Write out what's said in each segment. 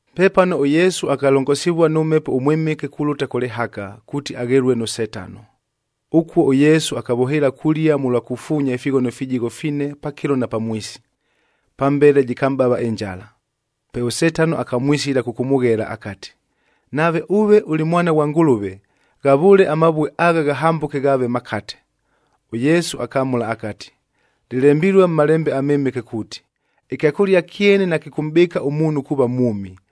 Pepano ʉYesu akalongosivua nʉ Mhepo ʉMwɨmɨke kulʉta kʉ lɨhaka, kuuti aghelue nʉ Setano. Ʉkuo ʉYesu akavʉhɨɨla kulia mʉlwa kufuunyaa ifighono fijigho fine pakɨlo na pamwisi. Pambele jɨkamʼbava ɨnjala. Pe ʉSetano akamwisila kʉkʉmʉghela akati, “Nave ʉve ʉlɨ Mwana ghwa Ngʉlʉve, ghavʉʉle amavue agha ghahambʉke ghaave makate.” ɄYesu akamʉla akati, “Lɨlembilue mʉ Malembe aMɨmɨke kuuti, ‘Ɨkyakʉlia kyene nakɨkʉmʼbɨɨka ʉmuunhu kuuva mwʉmi,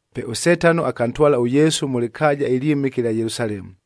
Pe ʉSetano akantwala ʉYesu mʉ lɨkaaja ɨlyɨmɨke ɨlya Yelusalemu.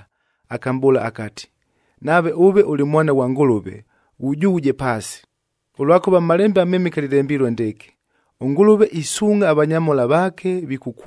akamʼbʉʉla akati, “Nave ʉve ʉlɨ Mwana ghwa Ngʉlʉve, ghujughuje paasi, ʉlwakʉva mʉ Malembe aMɨmɨke lɨlembilue ndɨɨkɨ, ‘ɄNgʉlʉve isuungʼha avanyamhola vaake,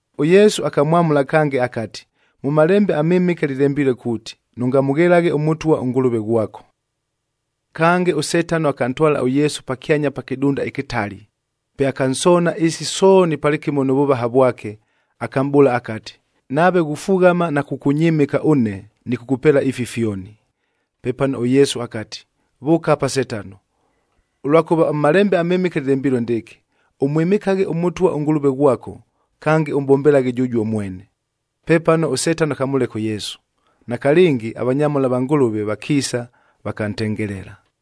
ɄYesu akamwamʉla kange akati, “Mʉ Malembe aMɨmɨke lɨlembilue kuuti, ‘Nʉngamʉghelaghe ʉMʉtwa, Kange, ʉSetano akantwala ʉYesu pakyanya pa kɨdunda ɨkɨtali, pe akansoona ɨɨsi sooni palɨkɨmo nʉ vʉvaha vwake, akamʼbʉʉla akati, “Nave ghufughama na kʉkʉnyɨmɨka ʉne, nɨkʉkʉpeela ifi fyoni.” Pepano ʉYesu akati, “Vʉʉka apa Setano! Ʉlwakʉva mʉ Malembe aMɨmɨke lɨlembilue ndɨɨkɨ, ‘Ʉmwɨmɨkaghe ʉMʉtwa ʉNgʉlʉve ghwako, kange ʉmʼbombelaghe jʉjuo mwene.’f” Pepano ʉSetano akamʉleka ʉYesu. Nakalɨngi, avanyamhola va Ngʉlʉve vakiisa, vakantengelela.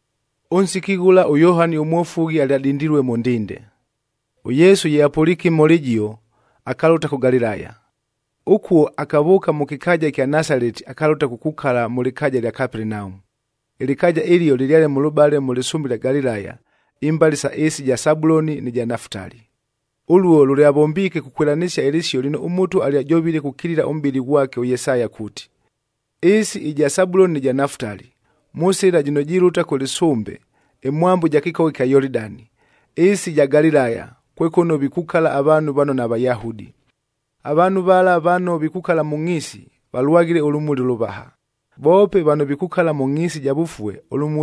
Ʉnsiki ghʉla ʉYohani ʉMwofughi alyadindilue mʉ ndinde. ɄYesu ye apʉliike ɨmhola ɨjio, akalʉta kʉ Galilaya. Ʉkuo, akavʉʉka mʉ kɨkaaja ɨkya Nasaleti akalʉta kukukala mʉ lɨkaaja ɨlya Kapelenaumu. Ɨlɨkaaja ɨlio lɨlyale mʉlʉbale mʉ lɨsʉmbe ɨlya Galilaya, imbale isa ɨɨsi ɨja Sabuloni nɨ ja Nafutali. Ʉluo lʉlyavombiike kukwɨlanɨsia ɨlɨsio lɨno ʉMʉtwa alyajovile kukilila ʉmʼbɨli ghwake ʉYesaya kuuti, “Ɨɨsi ɨja Sabuloni nɨ ja Nafutali, mʉ sɨla jɨno jilʉta kʉ lɨsʉmbe, ɨmwambo ja kɨkogha ɨkya Yolidani, ɨɨsi ɨja Galilaya, kwe kʉno vikukala avaanhu vano naVayahudi. Avaanhu vala vano vikukala mʉ ngʼhiisi,g valwaghile ʉlʉmuli ʉlʉvaha; voope vano vikukala mʉ ngʼhiisi ɨja vʉfue,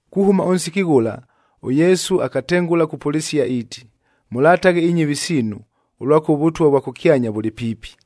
Kuhʉma ʉnsiki ghʉla, ʉYesu akatengʉla kupʉlɨsia iiti, “Mʉlataghe inyɨvi siinu, ʉlwakʉva ʉVʉtwa vwa kʉkyanya vʉlɨ piipi.”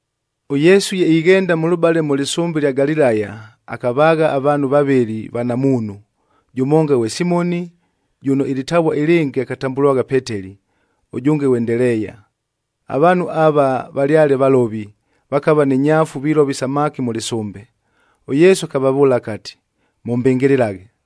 ɄYesu ye ighenda mʉlʉbale mʉ lɨsʉmbe ɨlya Galilaya, akavaagha avaanhu vavɨlɨ vanamuunhu, jʉmonga ghwe Simoni jʉno ɨlɨtavua ɨlɨngɨ akatambʉlwagha Peteli, ʉjʉnge ghwe Ndeleeya. Avaanhu ava valyale valovi, vakava ni nyaafu vilova isamaki mʉ lɨsʉmbe. ɄYesu akavavʉʉla akati, “Mʉmbɨngɨlɨlaghe!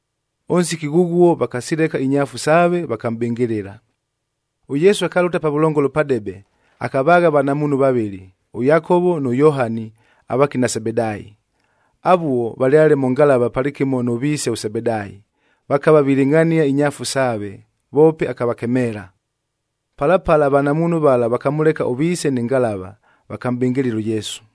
Ʉnsiki ghʉghuo vakasileka inyaafu saave, vakamʼbɨngɨlɨla. ɄYesu akalʉta pavʉlongolo padebe, akavaagha avanamuunhu vavɨlɨ, ʉYakovo nʉ Yohani avakina Sebedaayi. Avuo, valyale mʉ ngalava palɨkɨmo nʉ viise ʉSebedaayi, vakava vilɨngʼhania inyaafu saave, voope akavakemeela. Pala pala avanamuunhu vala vakamʉleka ʉviise nɨ ngalava, vakamʼbɨngɨlɨla ʉYesu.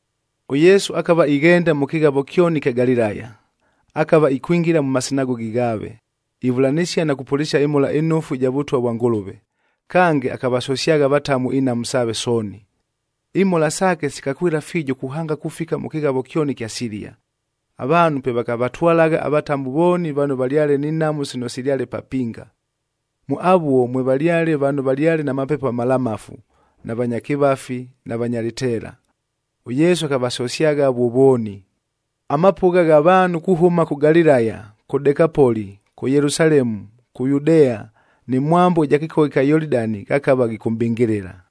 ɄYesu akava ighenda mʉ kɨghavo kyoni ɨkya Galilaya. Akava ikwingila mʉ masinagogi ghaave,j ivʉlanɨsia na kupʉlɨsia ɨMhola ɨNofu ɨja Vʉtwa vwa Ngʉlʉve, kange akavasosyagha avatamu inhamu saave sooni. Imhola saake sikakwɨla fiijo kuhanga kufika mʉ kɨghavo kyoni ɨkya Silia. Avaanhu pe vakavatwalagha avatamu vooni vano valyale ni nhamu sino silyale papinga. Mʉ avuo, mwevalyale vano valyale na mapepo amalamafu, na vanya kɨvafi na vanya lɨteela. ɄYesu akavasosyagha avuo vooni. Amapʉgha gha vaanhu kuhʉma kʉ Galilaya, kʉ Dekapoli,k kʉ Yelusalemu, kʉ Yudea nɨ mwambo ɨja kɨkogha ɨkya Yolidani ghakava ghikʉmʼbɨngɨlɨla.